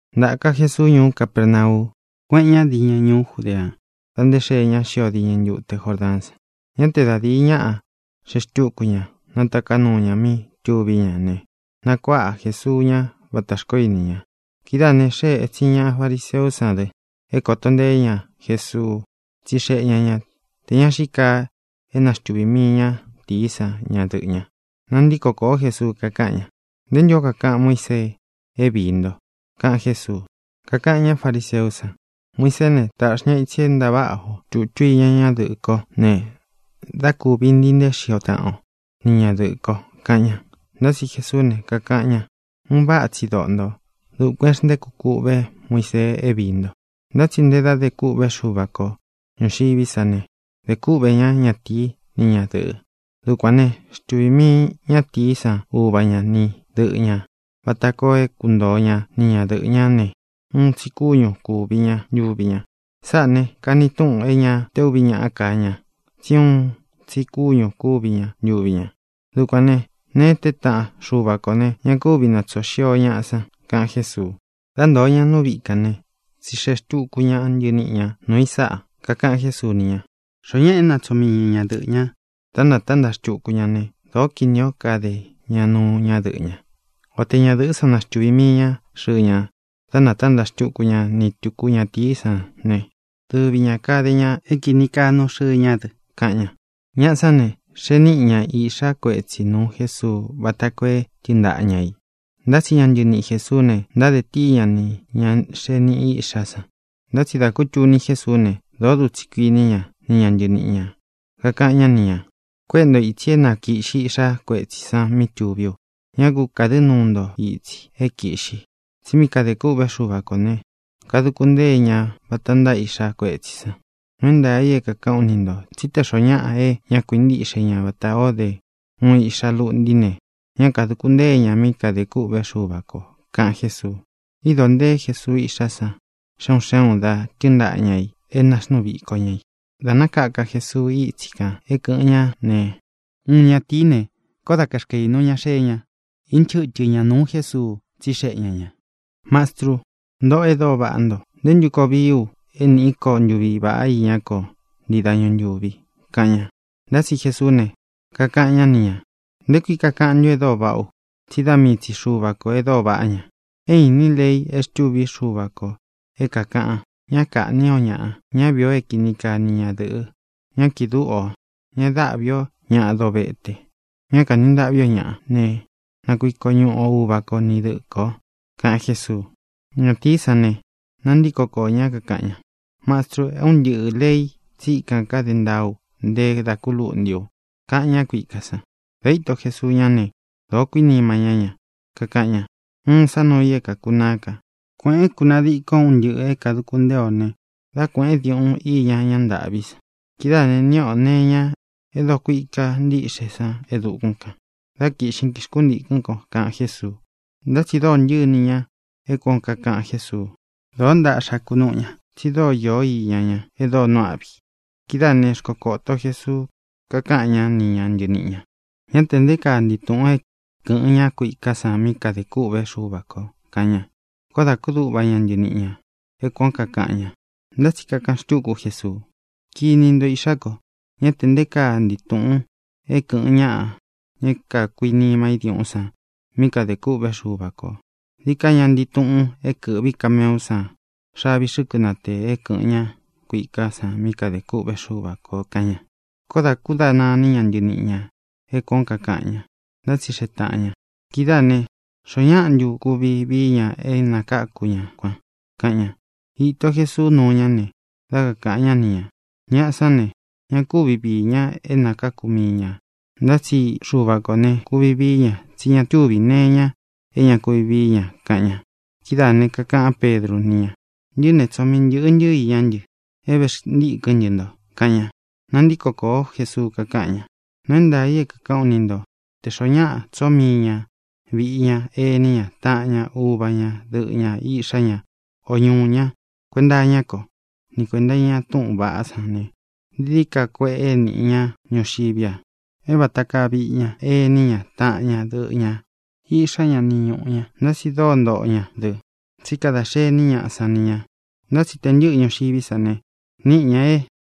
Ntāka Jesuu ñuú Capernau, kuéꞌen ña dīñɨ ñuú Judeá dā nté xee ña xio diñɨ ntute Jordaán san. Ñá te da dīi ñaꞌá xee xtúku ña, nātaká nuu ña mí tuví ña ne, nakuáꞌa Jēsuu ña vatā xkoó ini ña. Kidáā ne, xée ētsin ña fariseú san dɨ é kōto nteé ña Jesuu. Tsixeꞌe ña ña tē ña xíi kaa é naxtuvī mii ñátīí san ñadɨꞌɨ̄ ña. Nantíko kōó Jesuu, kakáꞌan ña: —¿Nte ntū ó kakaꞌan Muísee é viī nto? —kaꞌan Jésuu. Kakaꞌan ñá fariseú san: —Muiseé ne, tāꞌxi ña itsi é ntaváꞌa o tūtu iña ñadɨꞌɨ́ kō ne, dá kūvi ntii nteé xio taꞌan o ni ñadɨꞌɨ̄ ko —kaꞌan ña. Ntá tsi Jesuú ne, kakaꞌan ña: —Un váꞌa tsi doꞌo ntō. Dukuān é xntéku kūꞌvé Muisee é viī nto. Ntá tsi ntē dá de kûꞌvé Xuva ko ñūxiví sa ne, “de kúꞌvē ñá ñatīí ni ñadɨ̄ꞌɨ”. “Dukuān ne, xtúvī mii ñátīí san uva ña ni dɨꞌɨ ñā vata koo é kuntoo ña ni ñadɨꞌɨ̄ ñá ne, uun tsi kúñū kúvi ña ntuvi ña.” Sáꞌā ne, kani túꞌun é ñā té uvi ñaꞌá ka ña, tsí uun tsi kúñū kúvi ña ntuvi ña. Dukuān né, nēe é teé taꞌan Xuva kō ne, ña kúvi nātsoo xio ñaꞌa san —kaꞌan Jésuu. Dá ntōo ña nú viꞌi kān né, tsixeꞌe xtuku ña ntɨniꞌi ñā nuu i sáꞌa. Kakaꞌan Jésuu ni ña: —Xoó ñaꞌa é natsoo mii ña ñadɨꞌɨ̄ ña, dá nātántaꞌa xtuku ña ne, dōó kinī ó kade ña nuu ñadɨꞌɨ́ ña. O te ñadɨ̄ꞌɨ́ san naxtuvī mii ña xɨɨ ña, dá nātántaꞌa xtuku ña ni tuku ñatīí san ne, dɨvi ñā kade ña é kīni kaa nuu xɨɨ ña dɨ —kaꞌan ña. Ñaꞌa sán ne, xee níꞌi ña iꞌxá kuetsī nuu Jésuu vata koo é tɨɨn ntaꞌa ña ī. Ntá tsi ña ntɨniꞌi Jēsuú ne, ntáde tíi ña nī ña xee niꞌi iꞌxá i san. Ntá tsi dā kútuni Jésuú ne, dōó dutsi kuiní ña ni ña ntɨniꞌi ñā. Kakaꞌan ñá ni ñā: —Kuéꞌe ntō itsi é na kīꞌxi iꞌxá kuetsī san mí tuví u. Ñá ku kādɨ́ nuu nto itsi é kīꞌxi; tsí mí kadē kûꞌvé Xuva kō ne, kaduku ntée ña vata ntáa iꞌxá kuetsī san. Nuu é ntaā i é kākaꞌán u ni ntō tsí te xōo ñáꞌa é ña kákuintiꞌxe ña vatā ó de uun iꞌxa luꞌntí ne, ñá kadūku ntée ña mí kadē kûꞌvé Xuva kō —kaꞌan Jésuu. Īdo nteé Jesuu iꞌxá san xe un xé ūn, da tɨ́ɨn ntaꞌa ña ī e náxnuu viko ña i. Dā nákaka Jesuu ítsi kān é kɨ̄ꞌɨn ñá ne, uun ñatīí ne, koó da kaxkaīnu ña xee ña, inchɨ́tɨ ña nūu Jésuu, tsíxeꞌe ña ñā: —Mastrû, ntoꞌó e dóo vaꞌá nto, ¿nté ntu koo vií u é nīꞌí ko ntuvi vāꞌa iñá ko ntii dañu ntūvi? —kaꞌan ña. Ntá tsi Jesuú ne, kakaꞌan ñá ni ñā: —¿Nté kui kakaꞌan ntun e dóo vaꞌá u? Tsí da mii tsi Xuva kō e dóo vaꞌá ña. É īnín lei e xtúvi Xuva kō é kākaꞌan: “Ñá kāꞌní o ñāꞌa; ñá viī o é kini kaa ni ñadɨ̄ꞌɨ; ñá kīꞌi dúꞌu ō; ñá dāꞌví o ñāꞌa dovete; ñá kanī ntaꞌví o ñāꞌa, ne, na kuiko ñuꞌu o uva ko ni dɨꞌɨ kō” —kaꞌan Jésuu. Ñatīí san ne, nantíko koō ñá, kakaꞌan ña: —Mastru, é un ntɨꞌɨ̄ lei tsíkan káde ntaa ú nte da ku lúꞌntī u —kaꞌan ña kuiká san. Dā íto Jesuu ñá ne, dōó kuinima ñá ña. Kakaꞌan ña: —Uun sá nuu i é kākunaá ka: Kuēꞌén, kunadikon un ntɨꞌɨ̄ é kāduku ntée o ne, dá kuēꞌén diuꞌun i iña ña ntâꞌví san. Kidáā ne, niꞌi o nee iña é dokuika ntiꞌxé san e dukún kān. Dá kiꞌxin, kixntīkɨ́n ko —kaꞌan Jésuu. Ntá tsi dōo ntɨ́ꞌɨ iní ña é kuān ó kakaꞌan Jésuu. Dōó ntaꞌxa kunúꞌu ña, tsi dóo īo iña ña e dóo nuu áꞌvi. Kidáā né, xkokōto Jesuu, kakáꞌan ñá ni ña ntɨniꞌi ñā: —¡Ñá tē nté kaa ntii tūꞌun é kɨ̄ꞌɨn ña kuiká san mí kadē kûꞌvé Xuva kō! —kaꞌan ña. Koó dā kúduꞌva ña ntɨniꞌi ñā é kuān ó kakaꞌan ña. Ntá tsi kakaꞌan xtúku Jesuu: —Kini nto, īꞌxá ko, ¡ñá tē nté kaa ntii tūꞌun é kɨ̄ꞌɨn ñáꞌa, ña é kākuinima í diuꞌún san, mí kadē kûꞌvé Xuva kō! Dií ka ña ntii tuꞌun é kɨ̄ꞌví kameú san xavi xɨ́kɨ natēe é kɨ̄ꞌɨn ñá kuiká san mí kadē kûꞌvé Xuva kō —kaꞌan ña. Koó dā kúdana iní ña ntɨniꞌi ñā é kuān ó kakaꞌan ña. Ntátsixeꞌe tāꞌan ña: —Kidáā né, ¿xoó ñaꞌa ntu kuvi vií ña é nākáku ña kuan? —kaꞌan ña. Īto Jesuu núu ñá ne, dá kakāꞌan ñá ni ñā: —Ñaꞌa sán ne, ña kúvi viī ña é nākáku mii ñā. Ntá tsi Xuva kō ne, kuvi vií ña, tsí ña tuví nee iña é ña kuvi vií ña —kaꞌan ña. Kidáā ne, kakaꞌán Pedru ni ña: —Ntɨꞌɨ́ ne, tsoo mii ntɨ̄ꞌɨ ntɨ́ iñá ntɨ é vēxntíkɨ́n ntɨ nto —kaꞌan ña. Nantíko kōó Jesuu, kakáꞌan ña: —Nuu é ntaā i é kākaꞌán u ni ntō: Tē xoó ñaꞌa tsoo mii ña vīꞌi ña, ení ña, taꞌan ña, uva ña, dɨꞌɨ ñā, iꞌxá ña, o ñūꞌu ña kuenta iñá ko ni kuēnta iña túꞌūn vaꞌá san ne, dií dií ka kueꞌe níꞌi ña ñuxiví a é vata kaa viꞌi ñá, ení ña, taꞌan ña, dɨꞌɨ ñā, iꞌxá ña, ni ñūꞌu ña. Ntá tsi dóo ntoꞌo ña dɨ, tsí kada xení ñaꞌa san ni ñā. Ntá tsi tē ntɨ́ꞌɨ ñuxiví sa ne, níꞌi ñā é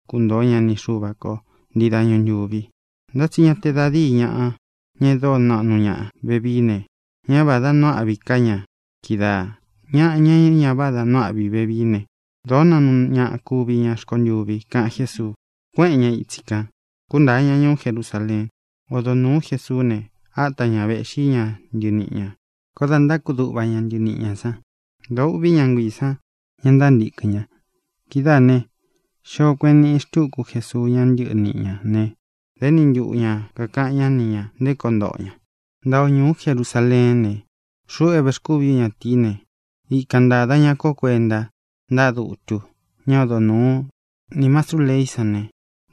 kuntoo ña ni Xuva ko ntii dañu ntūvi. Ntá tsi ña te da díi ñaꞌa, ña e dóo naꞌnu ñaꞌa vevií ne, ñá vādá nuu áꞌvi ká ña kídaā; ñaꞌa, ña é ña vádā nuu áꞌvi vevií ne, dōó naꞌnu ñaꞌa kuvi ña rkontûvi —kaꞌan Jésuu. Kuéꞌen ña itsi kan, kūntáa ña ñuú Jerusaleen. Odo nūú Jesuú ne, áta ña vēꞌxí ña ntɨniꞌi ñā. Koó dā ntákuduꞌva ña ntɨniꞌi ñā san. Dōo ûꞌví ña nguiī san, ña ntántīkɨn ña. Kidáā ne, xio kueꞌen níꞌi xtuku Jésuu ña ntɨníꞌi ñā né, dā éni ntuꞌu ña kākaꞌan ñá ni ñā nté koo ntoꞌo ña: —Ntaa o ñūú Jerusaleén ne, xuꞌu é vēxkúvi ú ñatīí ne, ikan ntāda ña kó kuenta ntáꞌa dutu ñá odo nūú nī mastrú leí san ne,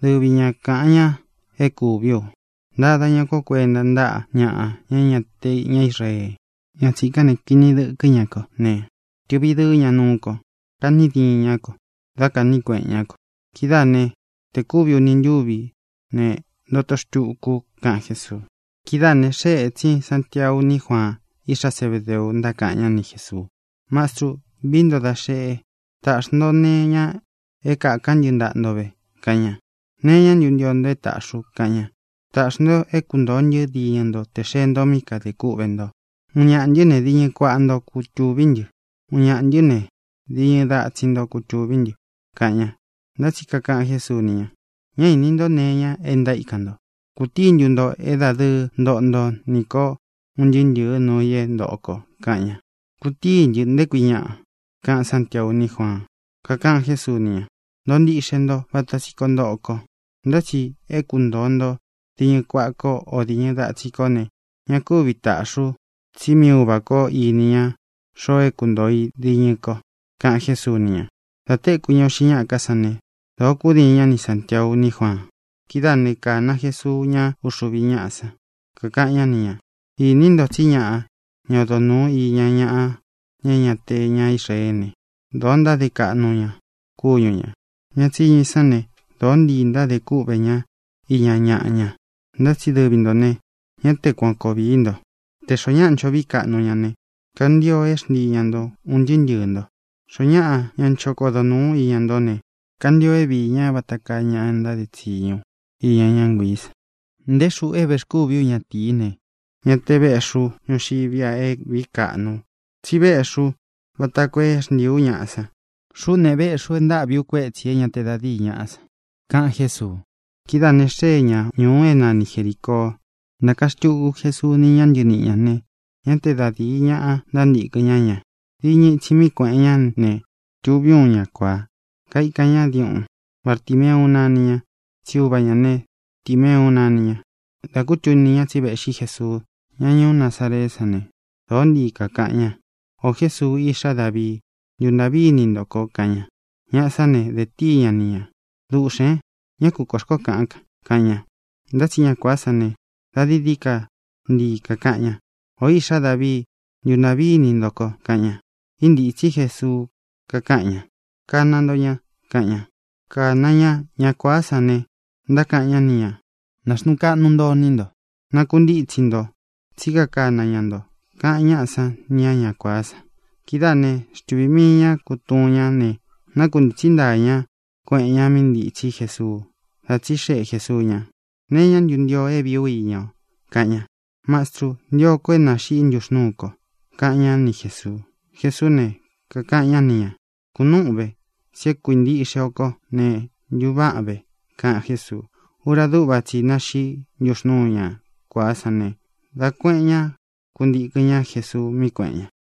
dɨvi ña kāꞌan ña é kūví u. Ntada ña kó kuenta ntáꞌa ñaꞌa, ña é ña te ña Israee. Ña tsīkán ne, kini dɨkɨ́ ña kó ne, tɨꞌvi dɨɨ́ ña nuú ko. Kani diín ña ko, dá kāꞌní kueꞌen ñá ko. Kidáā né, tē kúvi uni ntúvi ne, ntoto xtuku u —kaꞌan Jésuu. Kidáā ne, xée ētsin Santiau ní Juaan, iꞌxá Zebedeu, ntákaꞌan ñá ni Jēsuu: —Mastru, vií nto da xeꞌe, tāꞌxi nto nee iña é kākán ntɨ ntaꞌa nto ve —kaꞌan ña. —¿Nee iñá ntu ntio nto é tāꞌxi u? —kaꞌan ña. —Tāꞌxi nto é kuntōo ntɨ́ diñɨ nto tē xee nto mí kadā kúꞌvē nto. Uun ñaꞌā ntɨ́ ne, diñɨ kuaꞌa nto kutuví ntɨ; uun ñaꞌā ntɨ́ ne, diñɨ datsin nto kutuví ntɨ —kaꞌan ña. Ntá tsi kakaꞌan Jésuu ni ña: —Ñá īni ntó nee iña é ntaíkan nto. ¿Kūtií ntu nto é dadɨɨ ntoꞌo nto nī kó un ntɨɨ́ ntɨ̄ɨ́ nuu i é ntōꞌo ko? —kaꞌan ña. —Kutíi ntɨ, ¿nté kui ñaꞌa? —kaꞌan Sántiau ní Juaan. Kakaꞌan Jésuu ni ña: —Ntoꞌo ntiꞌxe nto vata tsi koo ntoꞌo ko. Ntá tsi é kuntōo nto diñɨ kuaꞌa ko o diñɨ datsin kó ne, ña kúvi tāꞌxi u, tsí mii Uva ko īni ña xoo é kuntōo i diñɨ ko —kaꞌan Jésuu ni ña. Dā téku ña uꞌxi ñáꞌa ká san ne, dōo kúdiin ña ni Sāntiau ní Juaan. Kidáā né, kāna Jesuu ñá uxuvi ñáꞌa san, kakaꞌan ñá ni ñā: —Ini nto tsí ñaꞌa, ña odo nūu iña ñaꞌa, ña é ña te ña Israeé ne, dōo ntáde kaꞌnu ña kúñu ñā. Ña tsiñu i sán ne, dōó ntii ntádē kúꞌvē ña iña ñaꞌa ña. Ntá tsi dɨvi ntō ne, ñá te kuan koo viī nto. Tē xoó ñaꞌa ncho vií kaꞌnu ña ne, kantio é xntii ña ntō un ntɨɨ́ ntɨɨ̄ nto. Xoó ñaꞌa, ña ncho kodo nūu iña ntó ne, kantio é viī ñá vata kaa ña ntáde tsiñu iña ñá nguiī san. Nté xūꞌu é vēxkúvi ú ñatīí ne, ñá te vēꞌxí u ñuxiví a é vīí kaꞌnu u, tsí véꞌxi ú vata koo é xntīi ú ñaꞌa san. Xuꞌú ne, véꞌxi u e ntáꞌvi u kuétsi ī é ña te da díi ñaꞌa san —kaꞌan Jésuu. Kidáā ne, xée ña ñūu é nani Jerīcoo. Ntāka xtuku Jesuu ni ña ntɨníꞌi ñā ne, ñá te da dīi ñaꞌa ntántīkɨn ñá ña. Diñɨ itsi mí kuēꞌen ñá ne, tuví uun ña kuāá, kaikan ña diuꞌun. Bartimeu nani ña, tsí uva ñā ne, Timeu nani ña. Dā kútuni ña tsi véꞌxi Jesuu, ña ñuú Nazareé san ne, dōó ntii kākaꞌan ña: —¡Ō Jésuu, Iꞌxá Davii, ntuntāꞌví ini nto ko! —kaꞌan ña. Ñaꞌa sán ne, dē tíi ña ni ñā: —¡Duꞌxēn! ¡Ñá ku kuān xkoó kaꞌan! —kaꞌan ña. Ntá tsi ña kuāá san ne, da dií dií ka ntii kākaꞌan ña: —¡O Iꞌxá Davii, ntuntāꞌví ini nto ko! —kaꞌan ña. Íntītsí Jesuu, kakáꞌan ña: —Kana nto ña —kaꞌan ña. Kana ña ña kuāá san ne, ntákaꞌan ñá ni ñā: —Nāxnuu kaꞌnu nto iní nto. Nakuntítsi nto, tsí kakana ña nto —kaꞌan ñáꞌa san nī á ña kuāá san. Kidáā né, xtuvī mii ña kútuun ñá ne, nákuntītsí ntaa ña, kueꞌen ña mí ntitsí Jesuu. Dā tsíxeꞌe Jēsuu ña: —¿Nee iñá ntu ntio o é vīí u iña o? —kaꞌan ña. —Mastrû, ntio ko é nāxiꞌi ntúxnūú ko —kaꞌan ñá ni Jēsuu. Jesuú ne, kakaꞌan ñá ni ñā: —Kūnúꞌun ve. Tsí e kuíntiꞌxe o kó ne, ntuváꞌan ve —kaꞌan Jésuu. Ura dúꞌva tsi i náxiꞌí ntuxnūu ñá kuāá san ne, dá kuēꞌen ñá, kuntikɨ̄n ñá Jesuu mí kuēꞌen ña.